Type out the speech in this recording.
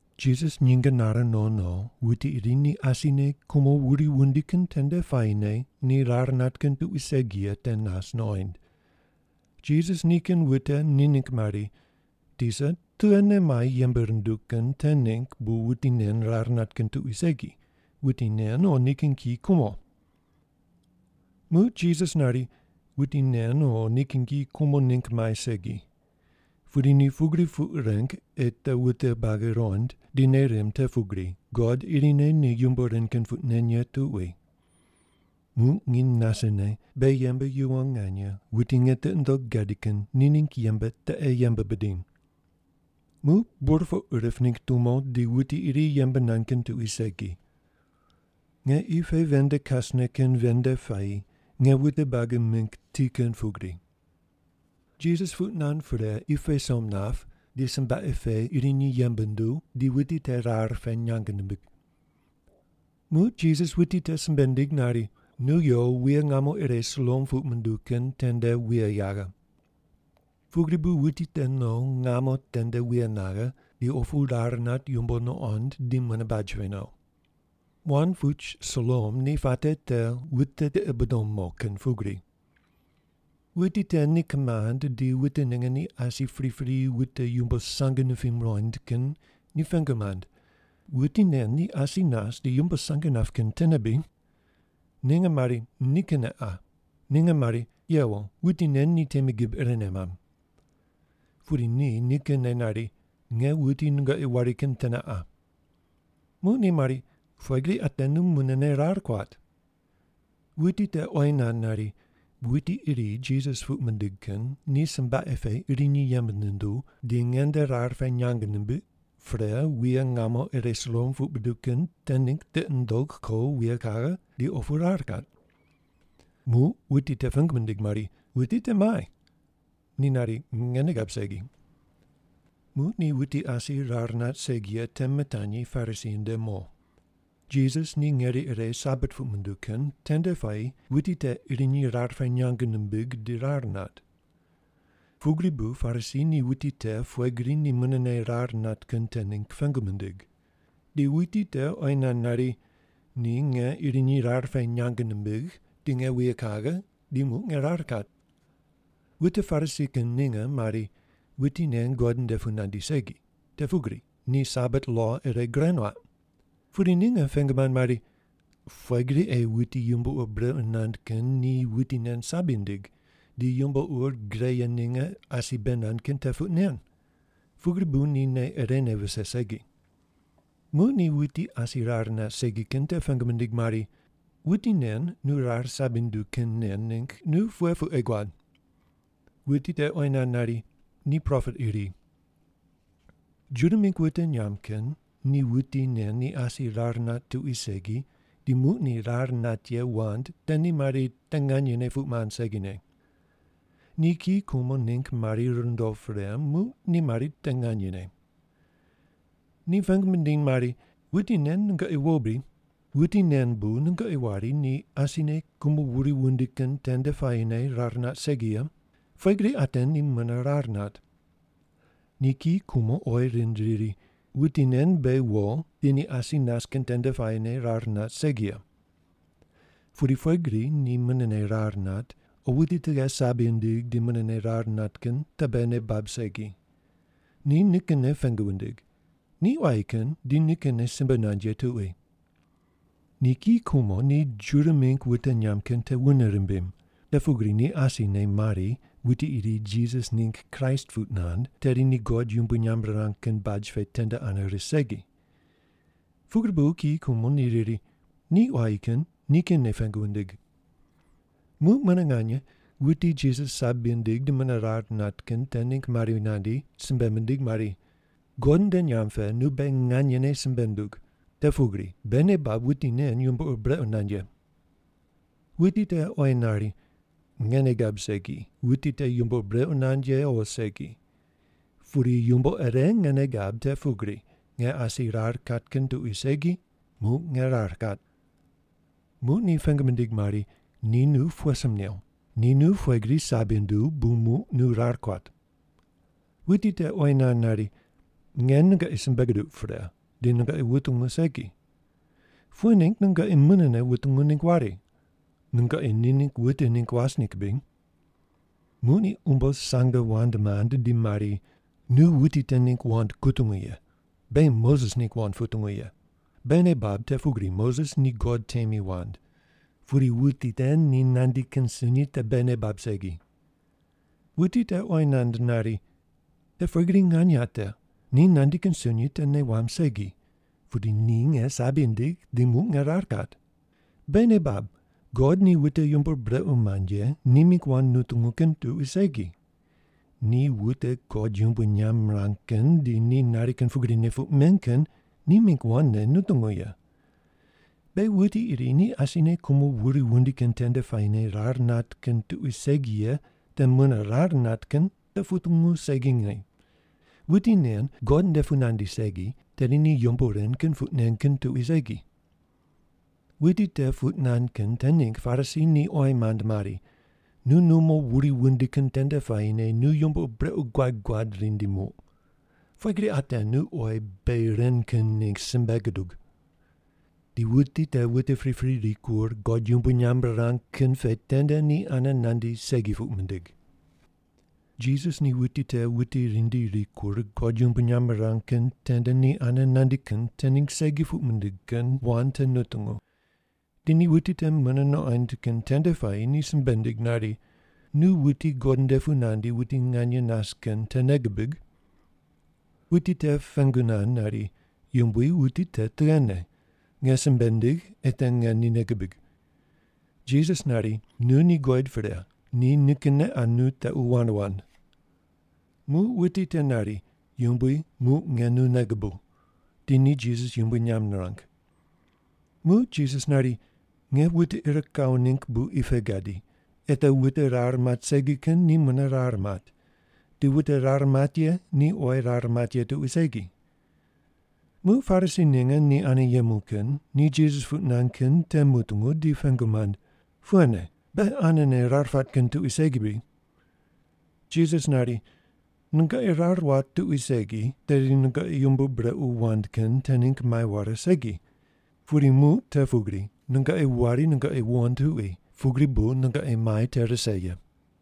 Jisas nyinge nare no no, wuti iri ni asine kumo wuri wundi kin tende puayine ni rar nat kin tuqui segi ye te nas nuqoind. Jisas nikin wute ni ningg mari, “Tisa, tughene mai yembe runduw kin te ningg bu wuti nen rar nat kin tuqui segi, wuti nen o nikin kiyi kumo?” Muq Jisas nari, “Wuti nen o nikin kiyi kumo ningg mai segi. Pudi ni pugri puq reng ei te wute buagi ruqond di nei rimb te pugri God irine ni yumbo ren kin puq nen ye tuqui. Muq nginy nasene beghi yembe yuwon nganye wuti nge tiqi nundogh gadi kin ni ningg yembe te ei yembe bidiny. Muq burpoq rip ningg tumo di wuti iri yembe nand kin tuqui segi. Nge qi pe ven nde kasne kin ven nde puayi nge wute buagi mingg ti kin pugri.” Jisas puq nand pre qi pe som nap, di sombaqe pe irinyi yembe nunduw, di wuti te rar pe nyang nimbig. Muq Jisas wuti te simbe nindig nari, “Nu yo wuye ngamo ire Siloam puq munduw kin tende wuye yaghe.” Pugri bu wuti te no wuye ngamo tende wuye naghe, di opu rar nat yumbo nuqond di mune baj pe no. (Wand puch Siloam ni puate te “wute tiqi bidom mo” kin pugri.) Wuti te ni kimand di wute ninge ni asi pripri wute yumbo sang nipim muqoind kin ni pengu mand, “Wuti nen ni asi nas di yumbo sang nap kin tene bri?” Ninge mari, “Nikinne qa.” Ninge mari, “Yewo, wuti nen ni temi gib irene mamb.” Pudi ni nikinne nari, “Nge wuti nungoqi wari kin tene qa.” Muq ni mari, “Pughe gri ate nu munene rar kuat?” Wuti te oyi nand nari, “Wuti iri Jisas puq mindig kin ni sombaqe pe irinyi yembe nunduw, di nge nde rar pe nyang nimbiq, pre wuye ngamo ire Siloam puq buduw kin te ningg tiqi nundogh ko wuye kaghe, di opu rar kat.” Muq wuti te pengu mindig mari, “Wuti te muai?” Ni nari, “Nge nei gab segi.” Muq ni wuti asi rar nat segi ye te mitanyi Parisi nde mo. Jisas ni ngeri ire Sabat puq munduw kin tende puayi wuti te irinyi rar pe nyang nimbig di rar nat. Pugri bu Parisi ni wuti te pughe gri ni munene rar nat kin te ningg pengu mindig. Di wuti te oyi nand nari, “Ni nge irinyi rar pe nyang nimbigh, di nge wuye kaghe, di muq nge rar kat.” Wute Parisi kin ninge mari, “Wuti nen God nde pu nandi segi, te pugri ni Sabat lo ire gure nuaq.” Pudi ninge pengu mand mari, “Pughe gri ei wuti yumbo ur brequ nand kin ni wuti nen sabi nindig, di yumbo ur gre ye ninge asi bei nand kin te puq nen?” Pugri bu ni nei irene vise segi. Muq ni wuti asi rar nat segi kin te pengu mindig mari, “Wuti nen nu rar sabi nunduw kin nen ningg nu pughe puq ei guad?” Wuti te oyi nand nari, “Ni propet iri.” Juda mingg wute nyamb kin ni wuti nen ni asi rar nat tuqui segi di muq ni rar nat ye wand te ni mari te nganyene puq mand segine. Ni kiyi kumo ningg mari rundo pre, muq ni mari te nganyene. Ni pengu mindiny mari, “Wuti nen nungoqi wo bri? Wuti nen bu nungoqi wari ni asine kumo wuri wundi kin tende puayine rar nat segi ye? Pughe gri ate ni mune rar nat?” Ni kiyi kumo oyi rind riri, “Wuti nen beghi wo di ni asi nas kin tende puayine rar nat segi ye. Pudi pughe gri ni munene rar nat o wuti tughe sabi nindig di munene rar nat kin te beghi nei bab segi. Ni nikinne pengu wundig. Ni quayi kin di nikinne simbe nand ye tuqui.” Ni kiyi kumo ni Juda mingg wute nyamb kin te wune rimbim, te pugri ni asine mari wuti iri Jisas ningg Kraist puq nand, tedi ni God yumbui nyamb rirang kin baj pe tende ane ris segi. Pugri bu kiyi kumo ni riri, “Ni quayi kin. Nikinne pengu wundig.” Muq mune nganye wuti Jisas sabi nindig di mune rar nat kin te ningg mari nandi, simbe mindig mari, “God nde nyamb pe nu beghi nganyene simbe ndug, te pugri beghi nei bab wuti nen yumbo ur brequ nand ye.” Wuti te oyi nari, “Nge nei gab segi, wuti te yumbo ur brequ nand ye o segi. Pudi yumbo ire nge nei gab te pugri nge asi rar kat kin tuqui segi, muq nge rar kat!” Muq ni pengu mindig mari, “Ni nu pughe sim new? Ni nu pughe gri sabi nunduw bu muq nu rar kuat?” Wuti te oyi nand nari, “Nge nungoqi simbe guduq pre, di nungoqi wutungu segi. Pughe ningg nungoqi munene wutungu ningg wari? Nungoqi ni ningg wute ningg was ningg bri?” Muq ni umbo sange wand mand di mari, “Nu wuti te ningg wand kutungu ye! Beghi Moses ningg wand putungu ye! Beghi nei bab te pugri Moses ni God temi wand, pudi wuti te ni nandi kin sunyi te beghi nei bab segi.” Wuti te oyi nand nari, “Te pughe gri nganye ate! Ni nandi kin sunyi te nei wamb segi, pudi ni nge sabi nindigh di muq nge rar kat. Beghi nei bab, God ni wute yumbo ur brequ mand ye ni mingg wand nutungu kin tuqui segi. Ni wute God yumbui nyamb mirang kin di ni nari kin pugrine puq men kin ni mingg wandne nutungu ye. Beghi wuti iri ni asine kumo wuri wundi kin tende puayine rar nat kin tuqui segi ye te mune rar nat kin te putungu segine. Wuti nen God nde pu nandi segi, tedi ni yumbo ren kin puq nen kin tuqui segi.” Wuti te puq nand kin te ningg Parisi ni oyi mand mari, “Nu numo wuri wundi kin tende puayine nu yumbo ur brequ guad guad rindi muq. Pughe gri ate nu oyi beghi ren kin ningg simbe gudug!” Di wuti te wute pripri rikur God yumbui nyamb rirang kin pe tende ni ane nandi segi puq mindig. Jisas ni wuti te wute rindi rikur God yumbui nyamb rirang kin tende ni ane nandi kin te ningg segi puq mindig kin wand te nutungu, di ni wuti te mune nuqoind kin tende puayi ni simbe nindig nari, “Nu wuti God nde pu nandi wuti nganye nas kin te nei gubig?” Wuti te pengu nand nari, “Yumbui, wuti te tughene? Nge simbe ndigh ei te nge ni nei gibig.” Jisas nari, “Nu ni guqoid pre. Ni nikinne qa nu tequ wand wand.” Muq wuti te nari, “Yumbui, muq nge nu nei gubuw.” Di ni Jisas yumbui nyamb nirang. Muq Jisas nari, “Nge wute ir kawo ningg bu qi pe gadi, ei te wute rar mat segi kin ni mune rar mat, di wute rar mat ye ni oyi rar mat ye tuqui segi.” Muq Parisi ninge ni ane yemu kin ni Jisas puq nand kin te mutungu di pengu mand, “Pughene? Beghi anene rar pat kin tuqui segi bri?” Jisas nari, “Nungoqi rar wat tuqui segi, tedi nungoqi yumbo ur brequ wand kin te ningg mai ware segi. Pudi muq te pugri nungoqi wari nungoqi wuqond tuqui, pugri bu nungoqi mai te rise ye.”